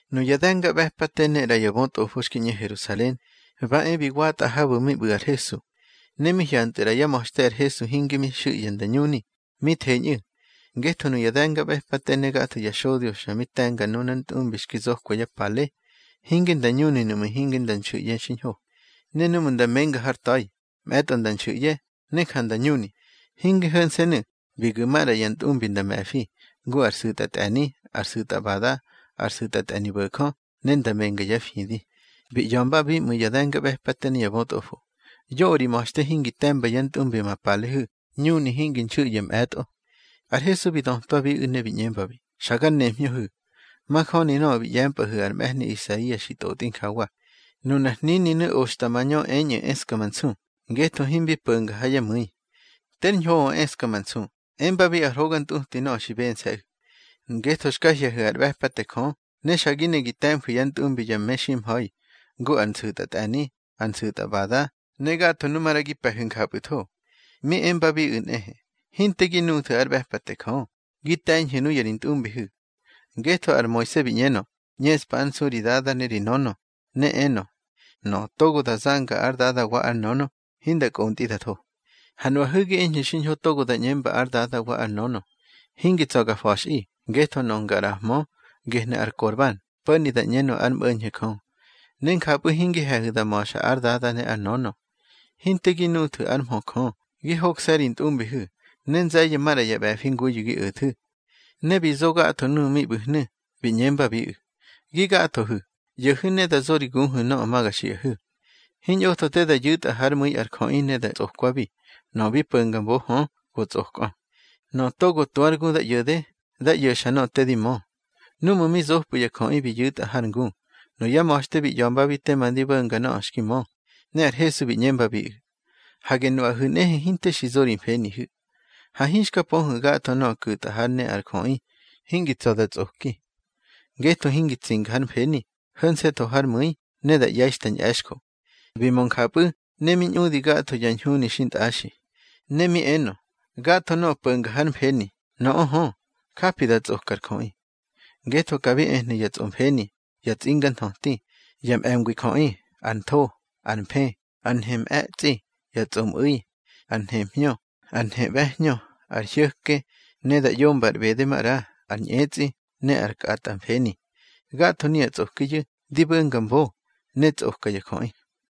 Nuya de̱ngaꞌbe̱pate ne ꞌra ya bötꞌofo xki ꞌñe Herusalen, ba e bi watꞌa habu̱ mi ꞌbu̱ ar Hesu. Ne mi hyantꞌu̱ ꞌra yá ma̱xte ar Hesu hinge mi xu̱ꞌye̱ nda ñuni, ne mi theñꞌu̱. Ngetho nuya de̱ngaꞌbe̱pate ne gatho ya xodyo xa mi te̱nga nunar ntꞌumbi xki zokwa yá pale, hinge nda ñuni nuꞌmu̱ hinge nda nxu̱ꞌye̱ xiñho. Ne núꞌmu̱ nda menga har ta̱i, mꞌe̱tꞌo nda nxu̱ꞌye̱, ne ja nda ñuni. Hinge ho̱nse̱nu̱, bi gu̱ maꞌra ya ntꞌumbi nda me̱fi, ngu ar su̱tꞌatꞌe̱ni, ar su̱tꞌbada, ar su̱tꞌatꞌe̱nibo̱jö, ne nda menga yá fidi. Bi ꞌya̱mbabi ꞌmu̱ ya de̱ngaꞌbe̱pate ne ya bötꞌofo: —Yoꞌö ri ma̱xte hingi te̱mba yá ntꞌumbi ma palehu̱, ñuni hingi nxu̱ꞌye̱ mꞌe̱tꞌo. Ar Hesu bi dötwabiꞌu̱ ne bi ꞌñembabi: —Xa gar nemhñöhu̱. Majöni nöꞌö bi ꞌye̱mpꞌahu̱ ar mꞌe̱hni Isaia xi tꞌotꞌi njawa: Nunar hnininu̱ oxta mañö eñꞌu̱ eska ma nsu, ngetho himbi po̱nga ha yá mu̱i. Ter ñhoꞌö eska ma nsu, embabi ar hoga ntꞌuti nöꞌö xi bense̱ꞌu̱. Ngetho xka hye̱hu̱ ár ꞌbe̱pate Jö, ne xa gi ne gi te̱mfu̱ yá ntꞌumbi ya meximha̱i, ngu ar nsu̱tꞌatꞌe̱ni, ar nsu̱tꞌbada, ne gatho nu maꞌra gi pe̱hu̱ njapꞌu̱tho. Mi embabiꞌu̱ nꞌehe: —Hinte gi nuthu̱ ár ꞌbe̱pate Jö, gi te̱ñhu̱ nuya ri ntꞌumbihu̱. Ngetho ar Moise bi ꞌñenö: ꞌÑeꞌspa ár nsu ri dada ne ri nönö. Ne enö: Nöꞌö togo da zanga ár dada wa ár nönö, hinda kꞌontꞌi da tho. Ha nuꞌahu̱ gi eñhu̱ xiñho togo da ꞌñemba ár dada wa ár nönö: Hingi tsa̱ ga fa̱xꞌi, ngetho nöꞌö nga ꞌraꞌahmö, gehnu̱ ar Korban (po̱ni da ꞌñenö ár mꞌo̱ñho̱ Jö). Ne njapꞌu̱ hingi he̱hu̱ da ma̱xa ár dada ne ár nönö. Hinte gi nuthu̱ ár mhö Jö, gi hokse̱ ri ntꞌumbihu̱, ne nze̱ye̱ maꞌra ya ꞌbe̱fi nguyu̱ gi o̱thu̱. Ne bi zo gatho nuꞌu̱ mi ꞌbu̱hnu̱, bi ꞌñembabiꞌu̱: —Gi gathohu̱, ꞌyo̱hu̱ ne dá zo ri guhu̱ nöꞌö ma ga xiꞌahu̱. Hiñꞌotho te da yu̱tꞌa hár mu̱i ar jöꞌi ne da tsꞌokwabi. Nöꞌö bi po̱nga mbo hö, go tsꞌokꞌö. Nöꞌö togo tu ár gu da ꞌyo̱de, dá ꞌyo̱xa nöꞌö te di mö. Núꞌmu̱ mi zopꞌu̱ ya jöꞌi, bi yu̱tꞌa har ngu, nuyá ma̱xte bi ꞌya̱mbabi tema ndi bo̱nga nöꞌö xki mö. Ne ar Hesu bi ꞌñembabiꞌu̱: —Hage nuꞌahu̱ nꞌehe hinte xi zo ri mfenihu̱. Ha hinxka pöhu̱ gatho nöꞌö ku̱tꞌa hár ne ar jöꞌi, hingi tsa̱ da tsꞌoki. Ngetho hingi tsinga hár mfeni, ho̱nse̱ tho hár mu̱i, ne da ꞌye̱i xta ñꞌe̱xjo. Bi mö njapꞌu̱, ne mi ñꞌudi gatho ya ñhuni xintꞌaxi. Ne mi enö: —Gatho nöꞌö po̱nga hár mfeni, nöꞌö hö, japi da tsꞌoka ar jöꞌi. Ngetho ka bi ehnu̱ ya tsꞌomfeni, ya tsꞌinga nthöti, ya mꞌe̱ngwi jöꞌi, ar ntho, ar mfë, ar nhemꞌe̱tsꞌi, ya tsꞌomꞌu̱i, ar nhemhñö, ar nheꞌbe̱hñö, ar hyo̱ke, ne da ꞌyomba ar ꞌbede maꞌra, ar ñꞌetsꞌi, ne ar kꞌatꞌamfeni. Gatho nuya tsꞌokiyu̱, di bo̱nga mbo, ne tsꞌoka ya jöꞌi.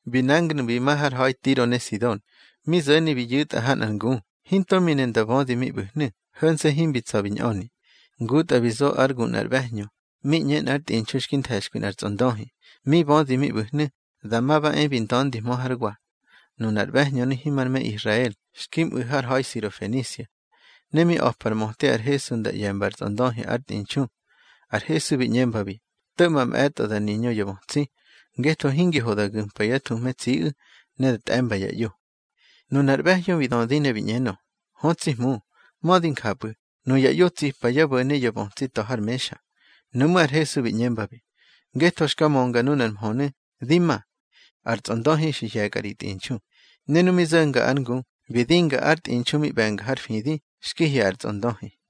Bi nangu̱nu̱ bi ma har ha̱i Tiro ne Sidon. Mi zo̱ni bi yu̱tꞌa ha nꞌar ngu, hinto mi ne nda bödi mi ꞌbu̱hnu̱, ho̱nse̱ himbi tsa̱ bi ñꞌöni. Ngutꞌa bi zo ár gu nꞌar ꞌbe̱hñö mi ꞌñe nꞌár tꞌinxu xki nthe̱xkwi nꞌar tsꞌondöhi. Mi bödi mi ꞌbu̱hnu̱, dama ba e bi nda̱ndihmö hár wa. Nunar ꞌbe̱hñönu̱ himar me Israel, xki mꞌu̱ har ha̱i Sirofenisia. Ne mi a̱pa ar möte ar Hesu nda ꞌye̱mba ar tsꞌondöhi ár tꞌinxu. Har Hesu bi ꞌñembabi: —To̱ꞌma mꞌe̱tꞌo da niñö ya bötsi, ngetho hingi ho da gu̱mpa yá thuhme tsiꞌu̱, ne da tꞌe̱mba ya ꞌyo. Nunar ꞌbe̱hñö bi dödi ne bi ꞌñenö: —Hö tsi Hmu, mödi njapꞌu̱, nuya ꞌyo tsipa yá bo̱ne ya bötsi ta̱ har mexa. Nuꞌmú̱ ar Hesu bi ꞌñembabi: —Ngetho xka mönga nunar mhönu̱, di ma. Ar tsꞌondöhi xi hye̱kꞌa ri tꞌinxu. Ne nu mi zo̱nga ár ngu, bi dinga ár tꞌinxu mi ꞌbe̱nga har fidi, xki hye̱ ar tsꞌondöhi.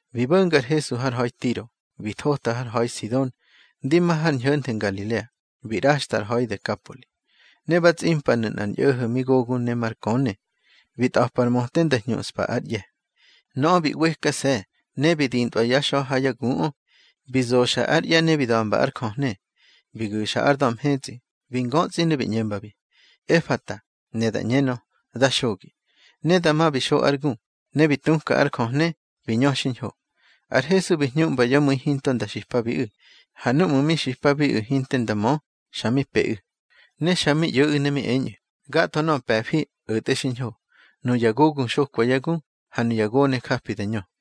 Bi bo̱nga ar Hesu har ha̱i Tiro, bi thota har ha̱i Sidon, ndi ma har ñho̱nthe Ngalilea, bi ꞌraxtꞌa ar ha̱i Dekapoli. Ne ba tsꞌimpanu̱ nꞌar ñꞌo̱ho̱ mi gogu ne mar köne, bi tꞌa̱pa ar möte nda hñuꞌspa ár ꞌye̱. Nöꞌö bi ꞌwekase̱, ne bi dintꞌwa yá xa̱ ha yá guꞌö. Bi zoxa ár ꞌye̱ ne bi da̱mba ár jöhne. Bi gu̱xa ár da̱ mhetsꞌi, bi ngötsꞌi ne bi ꞌñembabi: —Efata —ne da ꞌñenö: Dá xogi. Ne dama bi xo ár gu, ne bi tuka ár jöhne, bi ñö xiñho. Ar Hesu bi hñuꞌmba yá mu̱i hinto nda xipabiꞌu̱. Ha núꞌmu̱ mi xipabiꞌu̱ hinte nda mö, xa mi peꞌu̱. Ne xa mi ꞌyo̱ꞌu̱ ne mi eñꞌu̱: —Gatho nöꞌö pe̱fi, o̱tꞌe xiñho: nuya gogu xokwa yá gu, ha nuya gone japi da ñö.